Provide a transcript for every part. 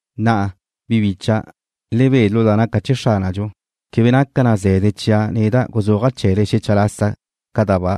Na'a, bi bicha', le be lu da naca chee̱ Xránadxu. Quebe naca na ze̱de chia' neda' guzúaja' chee̱le xecha lasa ca da ba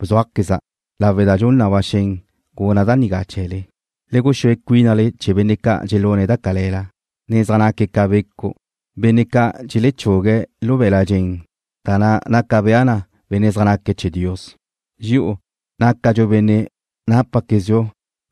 bzúajqueza', lawe' da dxun na ba xen guna' da nigá chee̱le. Le guxúe cuínale chee̱ benne' ca' dxelune̱' da cale̱la, ne zaj naque̱' ca becu', benne' ca' dxelechugue̱' lu be̱l-la' dxen da na' naca bea na benne' zaj naque̱' chee̱ Dios. Dxi'u nácadxu benne' nápaquezdxu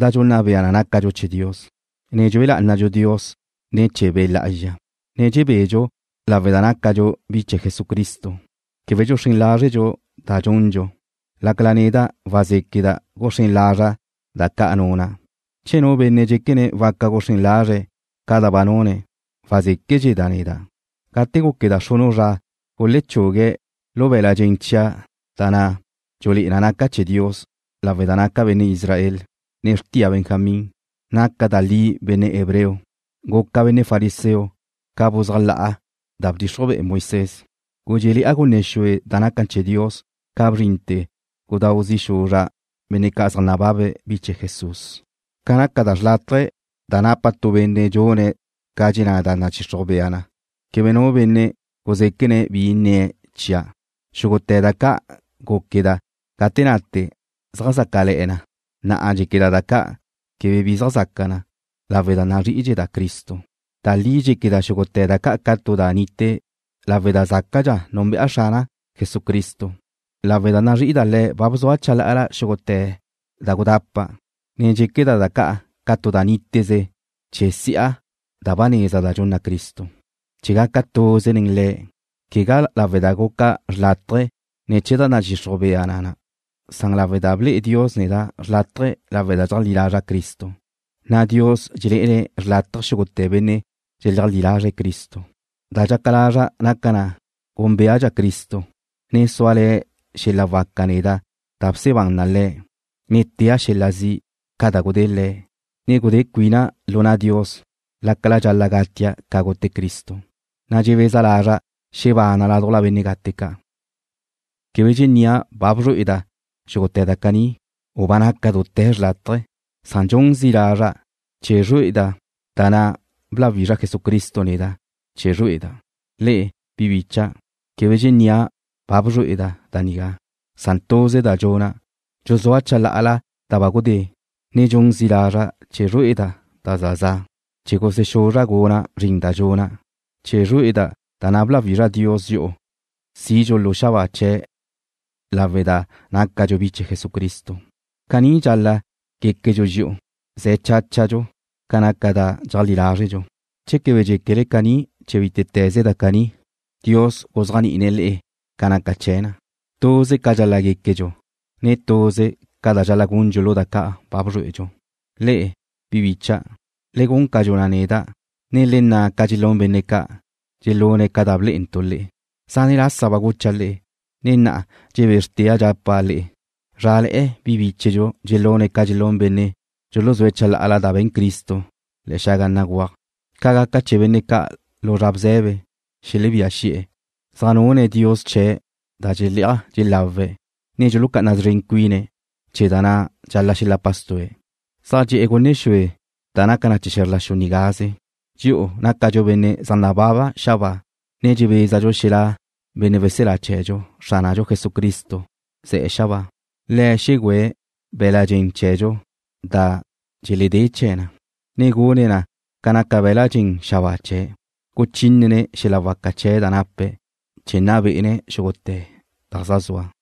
da dxunna bea na nácadxu chee̱ Dios, ne dxue lá'anadxu Dios ne̱ chee̱ Be' Lá'azxa, ne dxebedxu lawe' da nácadxu bi chee̱ Jesucristo. Quebe dxuxrén lázredxu da dxundxu, lácala neda' wazéqueda' guxrén lazra' da ca' nuna'. Che nu benne' dxéquene̱' waca guxrén lazre̱' ca da ba nune̱', wazéquedxeda' neda'. Gate gúqueda' xrunu' zra gulechugue̱' lu be̱l-la' dxen chia' da na' dxulé'e na naca' chee̱ Dios lawe' da naca' benne' Israel, ne xrtia Benjamín. Naca' da li benne' hebreo. Guca' benne' fariseo ca buzájla'a da bdxixruj be'e Moisés. Gudxéle̱'a gunne xue da naca chee̱ Dios ca bzrinte̱ gudáu zi' xuzra' benne' ca' zaj nácabe̱' bi chee̱ Jesús. Ca naca da xlátaje̱ da napa tu benne' dxune̱' ca dxenná da nadxixruj bea na, quebe nu benne' guzéquene̱' bi nnie̱' chia'. Xúgute̱ da ca' gúqueda' gate nate zaj zácale̱'e̱ na, na'a dxéqueda' da ca' quebe bi zaj zaca na, lawe' da nazrí'idxeda' Cristo. Da li dxéqueda' xúgute̱ da ca' ca tu da nite lawe' da zácadxa Xrana' Jesucristo. Lawe' da nazrí'ida' Le̱' ba bzua' chalá'ala xúgute̱ da gudapa', ne dxéqueda' da ca' ca tu da níteze chee̱ si'a da ba neza da dxunna Cristo, chee̱ gaca' tuze nen Le̱', quegá lawe' da guca' xlátaje̱ ne̱ chee̱ da nadxixruj bea na na', san lawe' da ble'e Dios neda' xlátaje̱ lawe' da dxeajlí lazra' Cristo, na' Dios dxelé'ene̱' xlátaje̱ xúgute̱ benne' dxeleajlí lazre̱' Cristo. Da dxaca lazra' naca na gúnbeadxa' Cristo, ne súale̱ xel-la waca neda' da bsebán na Le̱', ne tea' xel-la zi' ca da gudée̱' Le̱', ne gudé cuina' lu na' Dios lácala dxal-la' gatia' ca gute Cristo, na' dxebeza lazra' xebana' ládujla benne' gate ca'. Quebe dxennía' ba bzrué'eda' xúgute̱ da caní, u ba naca' dute̱ xlátaje̱, san dxun zi' lazra' chee̱ zrué'eda' da na' bláwizra Jesucristo neda' chee̱ zrué'eda'. Le'e, bi bicha', quebe dxennía' ba bzrué'eda' da nigá, san tuze da dxuna', dxuzúa' chalá'ala da ba gudé, ne dxun zi' lazra' chee̱ zrué'eda' da za za', chee̱ gusexuzra' guna' zrin da dxuna', chee̱ zrué'eda' da na' bláwizra Dios dxi'u sidxu lu xabáa chee̱' lawe' da nácadxu bi chee̱ Jesucristo. Caní dxal-la' guéquedxu dxi'u, ze̱ cháchadxu ca naca da dxeajlí lázredxu. Che quebe dxéquele caní chee̱ bítete̱ze da caní, Dios guzéajni'ine̱' le'e ca naca chee̱ na. Tuze ca dxal-la' guéquedxu, ne tuze ca dxal-la' gundxu lu da ca' ba bzrué'edxu. Le'e, bi bícha'dau', le gun ca dxuna' neda', ne le nna' ca dxelún benne' ca', dxelune̱' ca da blé'entu' le'e. Zane' lasa ba gucha' le'e, ne na'a dxebézrtea' dxapa' le'e, zrále̱'e̱ bi bíchedxu dxelune̱' ca dxelún benne' dxuluzúe̱' chalá'ala da be̱n Cristo le̱'e̱ xaga béguaj. Ca gaca chee̱ benne' ca' lu zra bze̱be, xelebía xi'e̱. Zaj nune̱' dios chee̱ da dxelé'aj dxelawe̱', ne dxulucá'ana szren cuine̱' chee̱ da na' dxal-la' xelapa stu'e̱. Zaj dxe'e̱ gunne xue da naca chee̱ xe̱zr la xu nigaze. Dxi'u nácadxu benne' zaj nababe̱' xabáa, ne dxebézadxu zra xelá' benne' weselá chee̱dxu, Xránadxu Jesucristo, ze̱'e̱ xabáa. Le̱' xegüe̱' be̱l-la' dxen chee̱dxu da dxeledé chee̱ na, ne gune̱' na ca naca be̱l-la' dxen xabáa chee̱', guchínene̱' xel-la waca chee̱' da nape̱' chee̱ nna bé'ene̱' xúgute̱ da zaj zua.